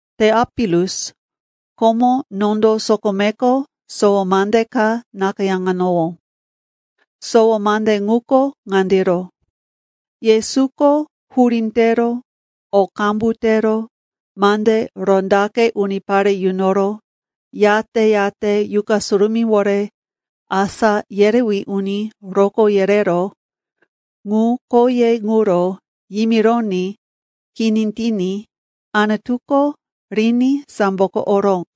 Teopilus, komo nondo sokomeko sowo mande ka nakayáŋanowó. Sowo mande ŋuko ŋandiro: Yesuko hurí tero o qambu tero mande rondaqe unipare yunoro, yate-yate Yuqa Surumíwore asá yerewí uni rokó yereró ŋu khoye ŋuro yimironí kini tiní Anutuko riní samboko oró.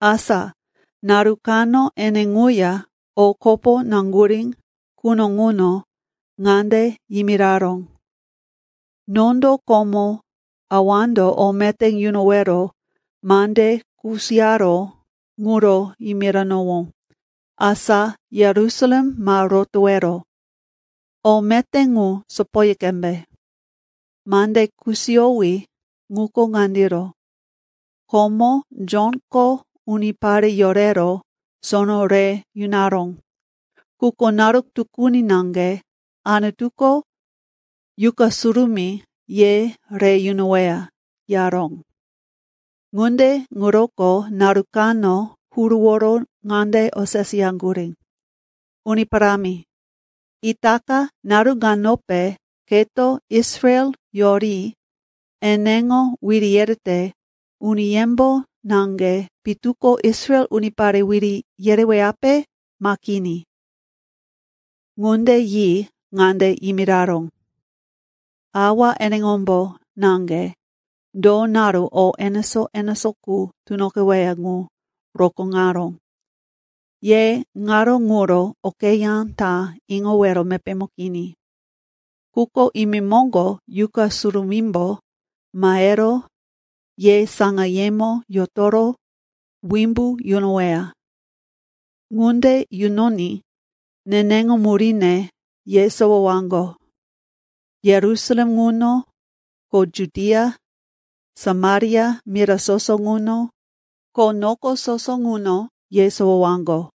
Asa naru kano ene ŋuya o kopo naŋgurí quno ŋuno ŋande yimiraró, “Nondo komo Awando o meté yunowero mande kusiyaró ŋuro yimiranowó. Asa Yerusalem ma rotowero, o meté ŋu sopoyi qembe. Mande kusiyowí ŋuko ŋandiro, komo Jonko unipare yorero sono re yunaró. Quko naru tukuni naŋge Anutuko Yuqa Surumí ye re yunoweya,” yaró. Ŋunde ŋuroko naru kano huruworo ŋande oseseyaŋgurí, “Uni Parámi, itaka naru ŋanope keto Israel yori eneŋo wiri yerete uniyembo naŋge pitu ko Israel unipare wiri yereweyape, ma kini?” Ŋunde yi ŋande yimiraró, “Awa eneŋombo naŋge do naru o enesó-enesó qu tunoqeweya ŋu rokóŋaró. Ye naru ŋuro okeyá ta iŋowero mepémo kini. Quko imemoŋgo Yuqa Surumímbo mahero ye saŋayemo yotoro wimbu yunoweya. Ŋunde yunoní neneŋo muríne yesowowaŋgo. Yerusalem ŋuno, ko Judia, Samaria mira soso ŋuno, ko noko soso ŋuno yesowowaŋgo.”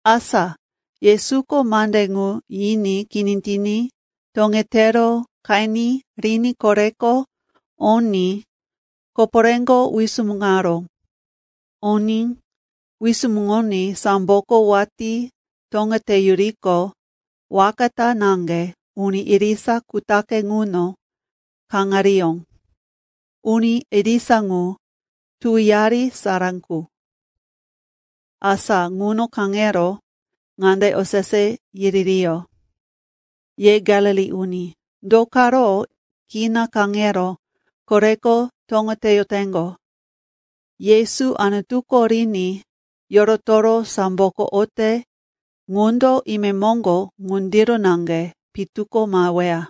Asa Yesuko mande ŋu yiní kini tiní toŋetero qeni riní koreko oní koporéko wisumuŋaró. Oní wisumuŋoní samboko watí toŋeteyuriqo, waka ta naŋge uni irisa kutaqe ŋuno kaŋariyó. Uni irisa ŋu tuwiyari sara qu. Asa ŋuno kaŋero ŋande osese yiririyó, “Ye Galili uni, do karo kina kaŋero koreko toŋeteyoteŋgo? Yesu Anutuko riní yorotoro samboko ote ŋundo imemoŋgo ŋundiro naŋge pitu ko maheweya.”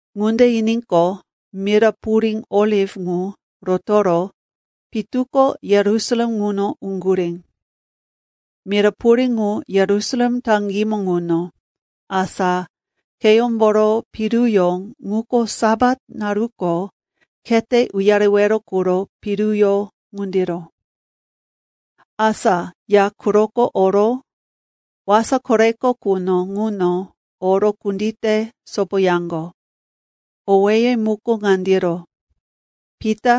Ŋunde yiníqo, mira purí Oliv ŋu rotoro pitu ko Yerusalem ŋuno uŋgurí. Mira purí ŋu Yerusalem taŋgímo ŋuno, asa kheyómboro piruyó ŋuko Sapat naruko khete uyarewero quro piruyó ŋundiro. Asa ya quroko oro wasa koreko quno ŋuno oro kundite sopoyaŋgo. Owéye muko ŋandiro: Pita,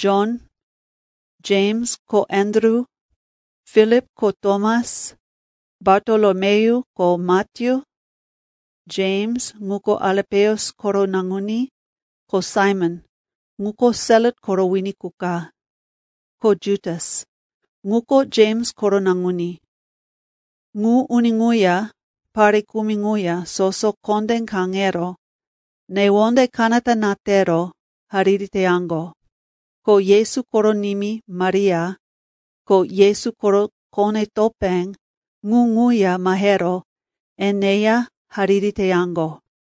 Jon, Jems ko Andru; Filip ko Tomas; Bartolomeyu ko Matyu; Jems, ŋuko Alipeus koro naŋuní; ko Saimon, ŋuko Selot koro wini qu ka; ko Jutas, ŋuko Jems koro naŋuní. Ŋu uni ŋuya pare kumi ŋuya soso kondé kaŋero newonde kanata na tero hariri teyaŋgo. Ko Yesu koro nimí Maria, ko Yesu koro kone-topé, ŋu ŋuya mahero eneya hariri teyaŋgo.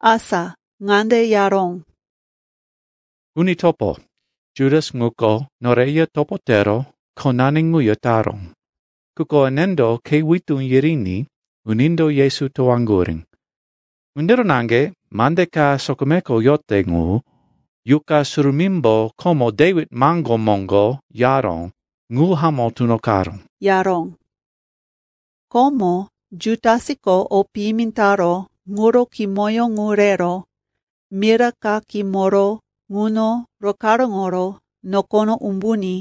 Asa ŋande yaró, “Uni topo, Jutas ŋuko noreya topo tero khonani ŋuya taró. Quko enendo khe witú yiriní unindo Yesu towaŋgurí. Ŋundiro naŋge mande ka sokomeko yote ŋu Yuqa Surumímbo komo Dewit maŋgó moŋgo yaró ŋu hamó tunoqaró,” yaró. (Komo Jutasko o piyimi taró ŋuro kimoyó ŋu rero mira ka kimoro ŋuno rokaráŋoro nokono umbuní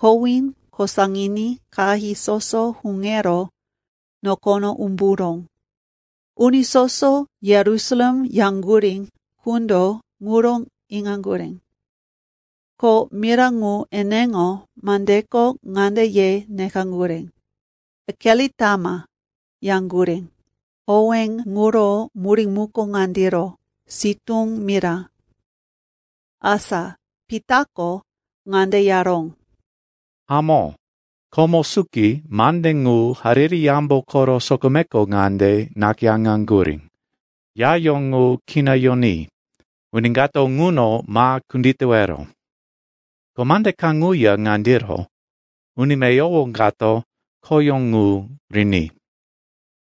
kowí kosaŋiní qahí soso huŋero nokono umburó. Uni soso Yerusalem yaŋgurí qundo ŋuro iŋaŋgurí. Ko mira ŋu eneŋo mandeko ŋande ye nekaŋgurí, “Akelitama,” yaŋgurí. Owé ŋuro murí muko ŋandiro, “Sitú Mira.”) Asa, Pitako ŋande yaró, “Hamó, komo suki mande ŋu Hariri Yambo koro sokomeko ŋande nakayáŋaŋgurí, “‘Yayó ŋu kina yoní, uni kato ŋuno ma kunditewero.’ “Ko mande kaŋuya ŋandiro, “‘Uni meyowo kato khoyó ŋu riní.’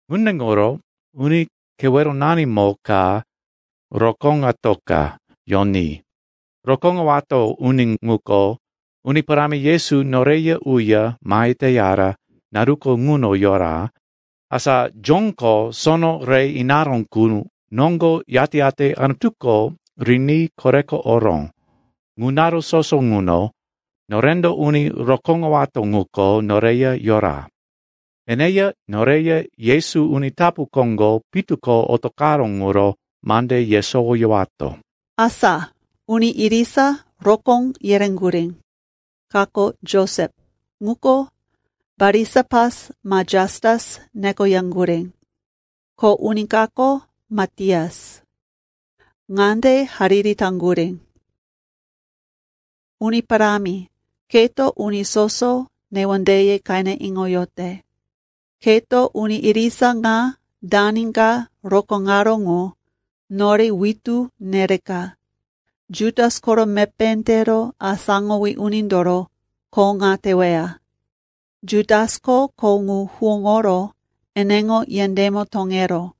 “Ŋunde ŋuro uni keweronanimo ka rokóŋatoka yoní. Rokóŋowato uni ŋuko Uni Parámi Yesu noreya uya mahe teyara naruko ŋuno yora, asa Jonko sono re inaró qu noŋgo yate-yate Anutuko riní koreko oró, ŋu naru soso ŋuno norendo uni rokóŋowato ŋuko noreya yora. Eneya noreya Yesu uni tapu koŋgo pitu ko otoqaró ŋuro mande yesowoyowato.” Asa uni irisa rokó yereŋgurí. Kako Josep, ŋuko Barisapas ma Jastus nekoyaŋgurí. Ko uni kako Matias. Ŋande hariri taŋgurí, “Uni Parámi, keto uni soso newondeye qene iŋoyote. Keto uni irisa ŋa dani ka rokóŋaró ŋu nore witú nereka Jutas koro mepé tero asáŋowí unindoro kho ŋa teweya. Jutasko kho ŋu huwóŋoro eneŋo yendémo toŋeró.”